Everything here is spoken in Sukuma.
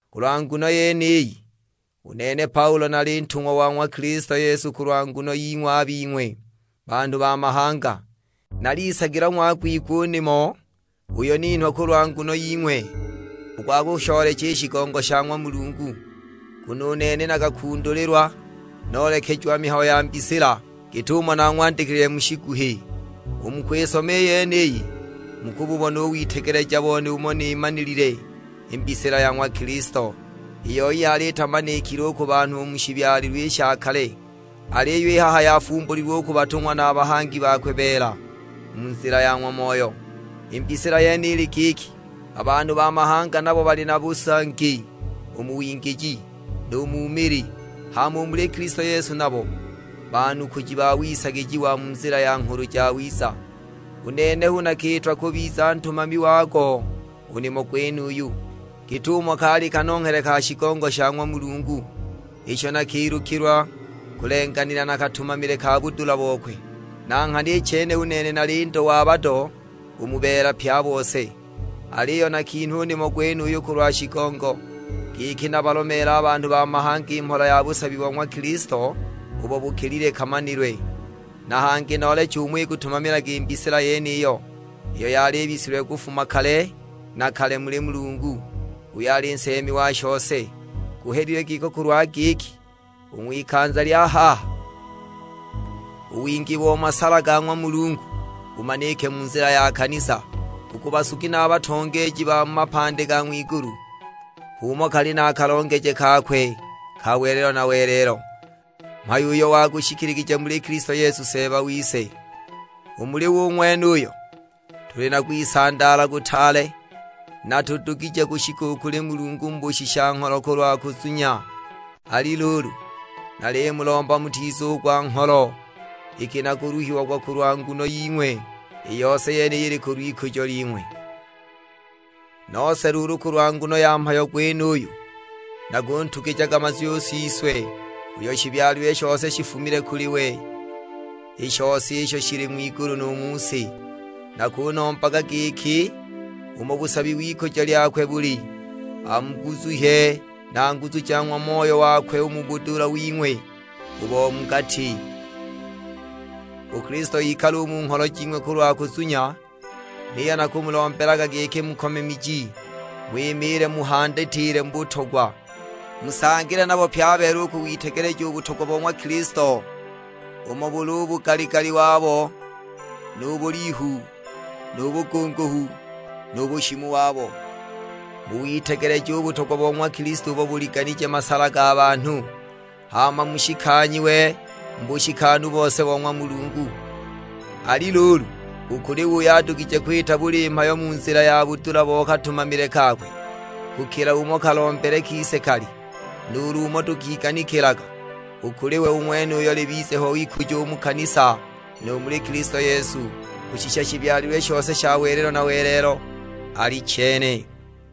Kulwa nguno yeniyi, u nene Paulo nali ntungwa wa ng'wa Kilisto Yesu kulwa nguno ying'we a bing'we banhu ba mahanga. Nalisagilwa ng'wagwigwa u nimo uyo ninhwa kulwa nguno ying'we; u gwa kushoolecha i shigongo sha ng'wa Mulungu. Nguno u nene nakakundulilwa, noolekejiwa mihayo ya mbisila, git'umo nang'wandikilile mu shiguhi. U mu kwisoma i yeniyi, mukububona u witegeleja bone umo nimanilile i mbisila ya ng'wa Kilisto. I yoi yali itamanikile u ku banhu u mu shibyalilwe i sha kale, aliyo i haha yafumbulilwe u ku batung'wa na a bahangi bakwe beela, mu nzila ya ng'wa Moyo. I mbisila yene ili giki, a banhu ba mahanga nabo bali na busangi u mu wingiji, nu mu mili; hama u muli Kilisto Yesu nabo banukuji ba wisagijiwa mu nzila ya Nghulu Jawiza. U nene hu nakiitwa kubiza ntumami wago u nimo gwenuyu, git'umo kali kanonghele ka shigongo sha ng'wa Mulungu, isho nakilukilwa kulenganila na katumamile ka budula bokwe. Na nghana i chene u nene nali ndo wa bado u mu beela pye a bose, aliyo nakinhwa u nimo gwenuyu kulwa shigongo, giki nabalomeele a banhu ba mahanga i mhola ja busabi bo ng'wa Kilisto, ubo bukilile kamanilwe. Na hangi nooleche umo ikutumamilaga i mbisila yeniyo, iyo yali ibisilwe kufuma kale na kale muli Mulungu, uyo ali nseemi wa shose. Guhelilwe giko kulwa giki, u ng'wikanza lya haha, u wingi bo masala ga ng'wa Mulungu bumanike mu nzila ya kanisa, u ku basugi na a batongeeji ba mu mapandi ga ng'wigulu. H'umo kali a kalongeje kakwe ka welelo na welelo, mhayo uyo wagushikiligije muli Kilisto Yesu Seeba wise. U muli we u ng'wenuyo, tuli na kwisandaala kutaale, na tudugije kushika u kuli Mulungu mu bushisha-ngholo kulwa kunzunya. Ali luulu, nalimulomba mutizugwa ngholo iki nakuluhiagwa kulwa nguno ying'we. I yose yeniyo ili kulw'ikujo ling'we. Nose luulu kulwa nguno ya mhayo gwenuyu, nakuntugijaga mazwi u Siswe, uyo shibyalilwe shose shifumile kuli we; i shose isho shili ng'wigulu nu mu si. Nakunombaga giki umo busabi w'ikujo lyakwe buli, amuguzuhye na nguzu ja ng'wa Moyo wakwe u mu bumunhu wing'we u bo mu gati. U Kilisto ikale u mu ngholo jing'we kulwa kuzunya; niyo nakumulombelaga giki mukome miji, ng'wimiile muhandatile mu butogwa. Musangile nabo pye a beela u kuwitegeleja u butogwa bo ng'wa Kilisto; umo buli u bugali-gali wabo, nu bulihu, nu bugunguhu, nu bushimu wabo. Muwitegeleje u butogwa bo ng'wa Kilisto ubo buliganije masala ga banhu; hama mushikanyiwe mu bushikanu bose bo ng'wa Mulungu. Ali luulu, u kuli we uyo adugije kwita buli mhayo mu nzila ya budula bo katumamile kakwe, kukila umo kalombele kise kali, nuulu umo tukiganikilaga; u kuli we u ng'wenuyo libize ho ikujo u mu kanisa nu muli Kilisto Yesu, kushisha shibyalilwe shose sha welelo na welelo: Alichene.